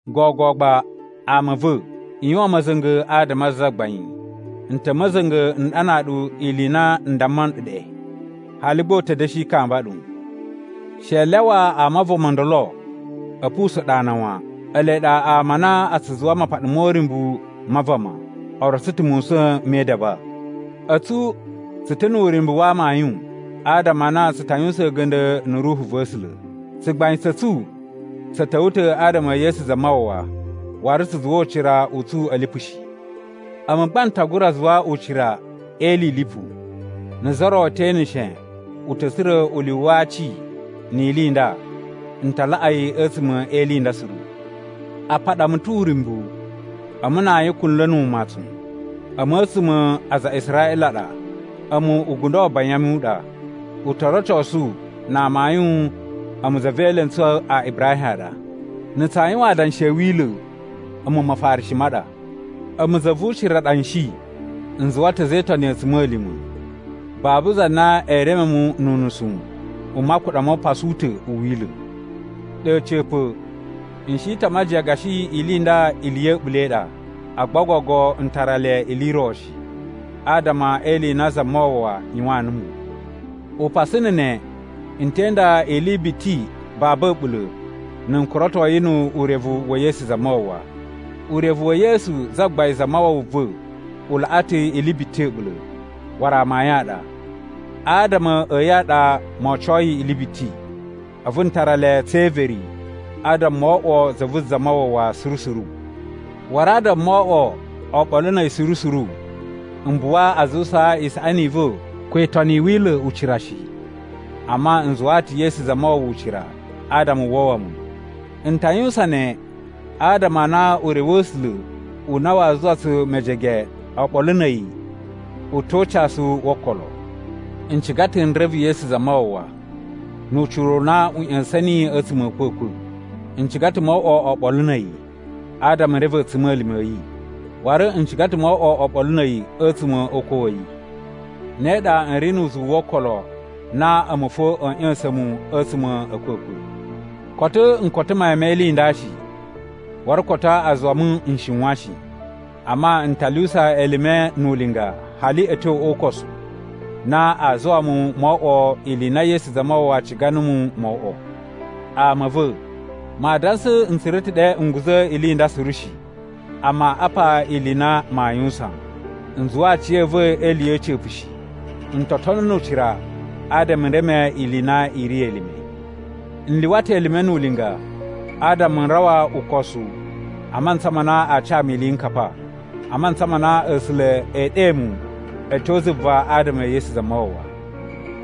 Gogo gba, ama a̱ va̱, i yuwan ma̱za̱nga̱ adama a Zagbain! N ta̱ ma̱za̱nga̱ n ɗanaa ɗu ili i na n damma nɗu ɗe. Hali gba u ta̱ da̱shi kamba ɗu. She i lyawa ama a vama o ndolo a̱ pusa̱n ɗu ana wan. Ele ɗa ama a na a tsu zuwa mapaɗa mo uryumbu ma vama, o rotso ta̱ musa̱n me idaba. A̱tsu tsu ta̱ nu uryumbu wa amayun adama a na tsu ta yuwusan a̱ga̱nda̱ na̱ Ruhu va̱ A̱sula̱. Tsugbain tsa̱ tsu tsa̱ ta̱wa̱ ta̱ adama e Yesu Zamawawa waru tsu zuwa ucira u tsu a̱ lipu shi. A̱mu gba n ta gura zuwa ucira e ili i lipu. Na̱ za ro te eneshe u ta̱ tsura̱ ulyuwu wa aci ni ili i nda, n ta laꞌa yi a̱tsuma̱ e ili i nda suru. A paɗa mu ta̱ uryumbu a̱mu na ayin kunla̱ nu umatsun. A̱mu a̱tsuma̱ a aza a Israꞌila a ɗa. A̱mu ugundo wa Banyami u ɗa. U to rocosu na amayun a̱mu za ve elentsu a Ibrahim a ɗa. Na̱ tsaa yuwan adanshi a̱ Wila̱, a̱mu Mafarishi ma ɗa. A̱mu za vu ucira ɗa n shi, n zuwa ta̱ a̱za̱ e Itoni a̱tsuma̱lima̱. Babu za na ee reme mu nu unusu u makuɗa mo upasu u ta̱ u Wila̱. Ɗe a̱ca̱pa̱, n shi ta̱ a majiyan gashi ili i nda ili ya̱ a̱ɓula̱ i ɗa, agba gogo n tara le ili i ro shi, adama e ili i na Zamawawa yuwaan numu. Upasu na̱ ne, n te inda ili biti babu a̱ɓula̱ na̱ n kurato yi nu urevu wa̱ Yesu Zamawawa. Urevu wa̱ Yesu Zagbain Zamawawa va̱ u laꞌa ta̱ ili biti a̱ɓula̱, waru amayun a ɗa. Adama a̱ yi a ɗa mo ocoyi ili biti, a̱vu n tara le tse everi adama mo oꞌwo za vu Zamawawa suru suru. Waru adama mo oꞌwo oɓolo na̱ a̱yi suru suru, m buwa a zuwusaa isaꞌani i va̱ ko itoni i wila̱ ucira shi, amma n zuwaa ta̱ Yesu Zamawawa ucira adama u wawa mu. N ta yuwusan ne adama a na ure wa̱ A̱sula̱ u na waa zuwa tsu mejege oɓolo na̱ a̱yi u to ucasu wo okolo. N ciga ta̱ n reve Yesu Zamawawa, nu ucira u na u ꞌya̱sa̱n niyi a̱tsuma̱ a̱ a̱kwa̱kwa̱. N ciga ta̱ mo oꞌwo oɓolo na̱ a̱yi, adama n reve a̱tsuma̱lima̱ a̱ yi. Waru n ciga ta̱ mo oꞌwo oɓolo na̱ a̱yi a̱tsuma̱ o ukwa̱ wa̱ yi. Ne ɗa n ri nu uzuwu wo okolo na a̱mu fo a̱a̱ ꞌya̱sa̱n mu a̱tsuma̱ a̱ a̱kwa̱kwa̱! Koto n koto mayan me ili i nda shi, waru koto a zuwa mu n shiwan shi. Amma n ta lyuwusa elime nu ulinga hali a̱ tyo o ukosu na aa zuwa mu mo oꞌwo ili i na Yesu Zamawawa ciga numu mo oꞌwo. Ama a̱ va̱, maa dansa n tsura̱ ta̱ ɗe n guza̱ ili i nda suru shi, amma apa ili i na maa yuwusan: N zuwa aciya̱va̱ e ili ya̱ a̱ca̱pa̱ shi, n to tono nu ucira adama n reme ili i na i ri elime. N lyuwa ta̱ elime nu ulinga adama n rawa ukosu a mantsa ma na aa ca mu iliyinkapa, a mantsa ma na A̱sula̱ ee ɗe mu a̱ tyo zuva adama e Yesu Zamawawa.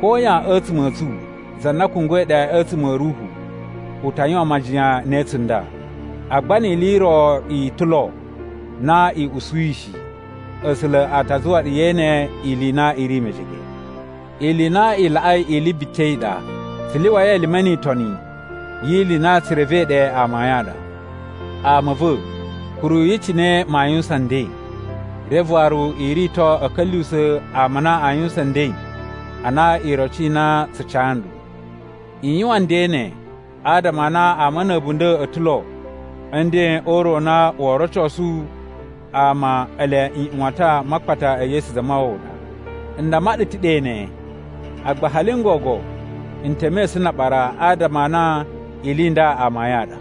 Koyan a̱tsuma̱ a̱ tsu za na kungwai ɗe a̱tsuma̱ a̱ Ruhu u ta yuwan majiyan ne tsunda. Agba ni ili i ro i ta̱ lo na i usuyi shi, A̱sula̱ a ta zuwa ɗu yee ene ili i na i ri mejege. Ili i na i laꞌai ili biti a̱yi ɗa: tsu lyuwai elime ni itoni yi ili i na tsu revei ɗe amayun a ɗa. Ama a̱ va̱, kuruyi cine maa yuwusan nden, reve waru i rito a̱ ka̱lyuwusa̱ ama a na a yuwusan nden ana iroci i na tsu ca nɗu. I yuwan nden ne, adama a na ama na̱ a̱bunda̱ a̱ ta̱ lo a̱ nden o ure u na woo rocosu ama ele nꞌyuwatan ma akpata e Yesu Zamawawa ɗa. N damma ɗu ta̱ ɗe ne, agba hali n gogo n te mesun na aɓara adama a na ili i nda amayun a ɗa.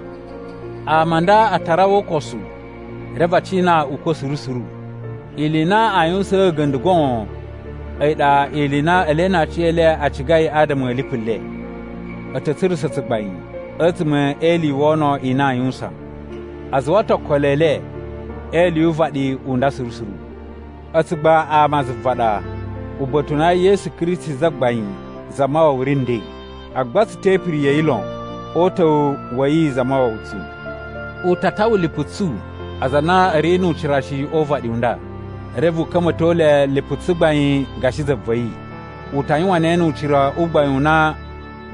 Ama a nda a ta rawa o ukosu reve a cina ukwa̱ suru suru. Ili i na aa yuwusaan a̱ga̱nda̱ goon a̱yi ɗa ili i na ele na aciyele a cigai adama a̱ lipu le. A̱ ta̱ tsurusa̱ tsugbain a̱tsuma̱ e ili i wono i na aa yuwusan. A zuwa ta̱ okolo e le e ili yu uvaɗi u nda suru suru. A̱tsu gba ama a zuva a ɗa, uba̱ta̱ u na Yesu Kristi Zagbain Zamawawa ri nden. Agba tsu te ipiri ya̱ yi lon o uta̱wu wa̱ yi Zamawawa tsu. U ta tawa lipu tsu aza a na a̱ ri nu ucira shi o uvaɗi u nda, reve u ka̱mba̱to le lipu tsugbain gashi za va̱ yi, u ta yuwan ne nu ucira u gbain u na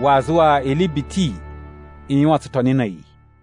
waa zuwa ili biti i yuwan tsutoni na̱ a̱yi.